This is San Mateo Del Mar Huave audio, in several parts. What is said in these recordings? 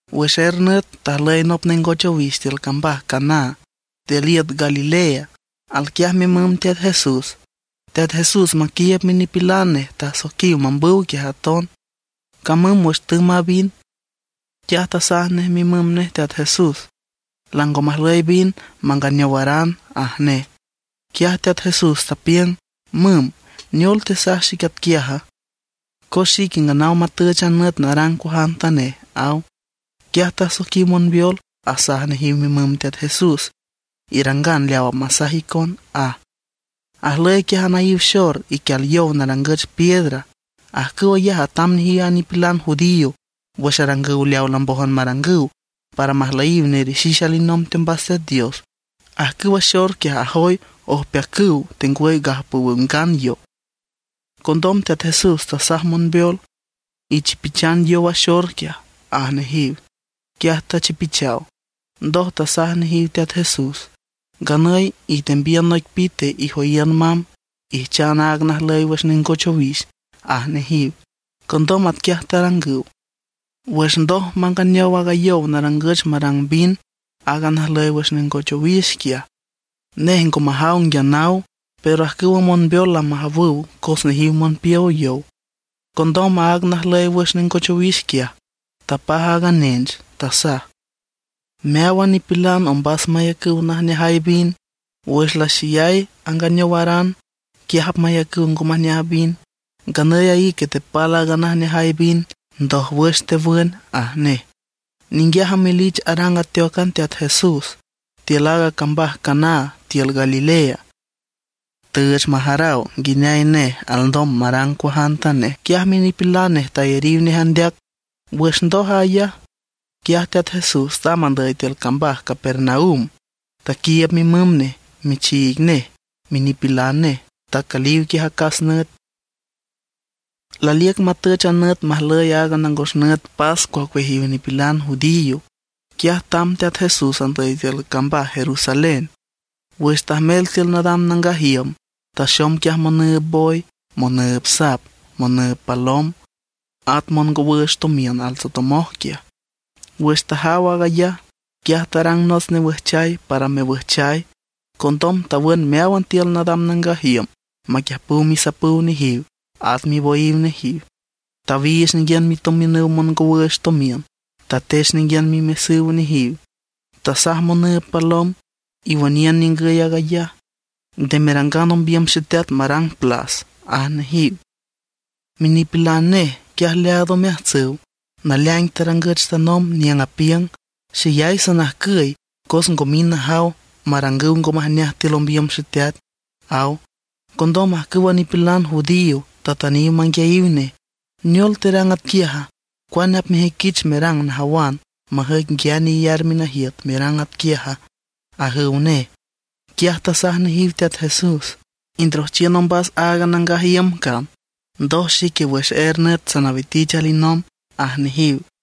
Wüx er nüt tajlüy nop nengoch owix tiül cambaj Caná tiül iüt Galilea. Alquiaj mimüm Teat Jesús. Teat Jesús maquiiüb minipilan nej tasoiquiw mambüw quiaj aton. Camüm wüx tümb a vin, quiaj tasaj nej mimüm nej Teat Jesús: ―Lango majlüy vin manganeowaran ―aj nej. Quiaj Teat Jesús tapiüng: ―Müm, ¿neol tesaj xic atquiaja? Cos xique nganaw matüch a nüt narang cuajantanej ―aw. Quiaj tasoiquiw monbeol, asaj nejiw mimüm Teat Jesús: ―Irangan leaw apmasaj icon ―aj. Ajlüy quiaj anaíw xor iquial yow narangüch piedra. Ajcüw ayaj atam nejiw a nipilan judío wüx arangüw leawa lambójan marangüw para majlüyiw nerixix alinomb teombas Teat Dios. Ajcüwa xor quiaj ajoy ojpeacüw tengwüy gajpowüw ngan yow. Condom Teat Jesús tasaj monbeol: ―Ichipichan yow a xor quiaj ―aj nejiw. Quiaj tachipichaw. Ndoj tasaj nejiw Teat Jesús: ―Nganüy itembiün noic pite, ijoyiün mamb, ijchan aaga najlüy wüx nengoch owix ―aj nejiw. Condom atquiaj tarangüw. Wüx ndoj manganeow aaga yow narangüch marang vin, aaga najlüy wüx nengoch owix quiaj, nej ngo majaw nguia naw. Pero ajcüwa monbeol lamajawüw cos nejiw monpiow yow. Condom aaga najlüy wüx nengoch owix quiaj, tapaj aaga nench, tasaj: ―Meáwan nipilan ombas mayacüw najneajay vin. Wüx laxeyay anganeowaran, quiaj apmayacüw ngo majneajay vin. Nganüy a ique tepal aaga najneajay vin, ndójwüx tewün ―aj nej. Ninguiaj amelich arang ateócan Teat Jesús tiül aaga cambaj Caná tiül Galilea. Tüüch majaraw nguineay nej alndom marang cuajantanej. Quiaj minipilan nej tayariw nej andeac. Wüx ndoj ayaj, quiaj Teat Jesús tamb andüy tiül cambaj Capernaum, taquiiüb mimüm nej, michiig nej, minipilan nej. Tacüliw quiaj acas nüt. Laliüc matüch a nüt majlüy aaga nangos nüt pascua ocueajiw nipilan judío. Quiaj tamb Teat Jesús andüy tiül cambaj Jerusalén. Wüx tajmel tiül nadam nangaj iüm, taxom quiaj monüüb boy, monüüb sap, monüüb palom, at mongowüüch tomiün altsotomoj quiaj. Wüx tajaw aag ayaj, quiaj tarang nots newüjchay para mewüjchay. Condom tawün meáwan tiül nadam nangaj iüm maquiüjpüw misapüw nejiw, at miboyiw nejiw. Tawiich ninguiün mitomiünüw mongowüüch tomiün; tatech ninguiün mimesüw nejiw. Tasaj monüüb palom: ―¡Iwüniün ningüy aag ayaj! Nde merangan ombiüm Xeteat marang plas ―aj nejiw. Minipilan nej quiaj leaad omeajtsüw naleaing tarangüch tanomb niüng apiüng: “Xeyay sanajcüy, cos ngo mind najaw marangüw ngo majneaj tiül ombiüm Xeteat”, aw. Condom ajcüwa nipilan judío tatüniw manguiayiw nej: ―¿Neol terang atquiaja, cuane apmejüiquich merang najawan, majüic nguiane iyar minajiüt merang atquiaja? ―ajüw nej. Quiaj tasaj nejiw Teat Jesús: ―Indrojchiün ombas aaga nangaj iüm cam, ndoj xique wüx er nüt sanawitich alinomb ―aj nejiw.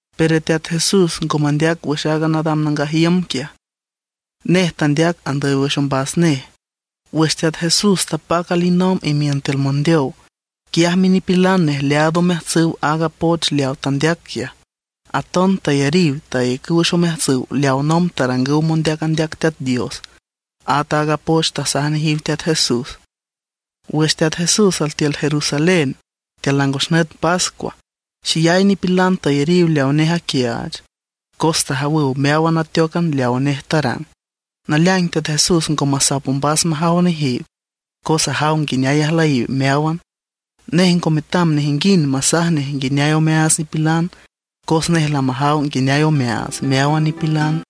Pero Teat Jesús ngo mandeac wüx aaga nadam nangaj iüm quiaj. Nej tandeac andüy wüx ombas nej. Wüx Teat Jesús tapac alinomb imiün tiül mondeow, quiaj minipilan nej leaad omeajtsüw aaga poch leaw tandeac quiaj. Aton tayariw tayacüw wüx omeajtsüw leawa nomb tarangüw mondeac andeac Teat Dios, at aaga poch tasaj nejiw Teat Jesús. Wüx Teat Jesús altiül Jerusalén tiül nangos nüt pascua, xeyay nipilan tayariw leaw nej aquiaach cos tajawüw meáwan ateócan leaw nej tarang. Naleaing Teat Jesús ngo masap ombas majaw nejiw, cos ajaw nguineay ajlüyiw meáwan. Nej ngo metam nejinguind masaj nej nguineay omeaats nipilan, cos nej lamajaw nguineay omeaats meáwan nipilan.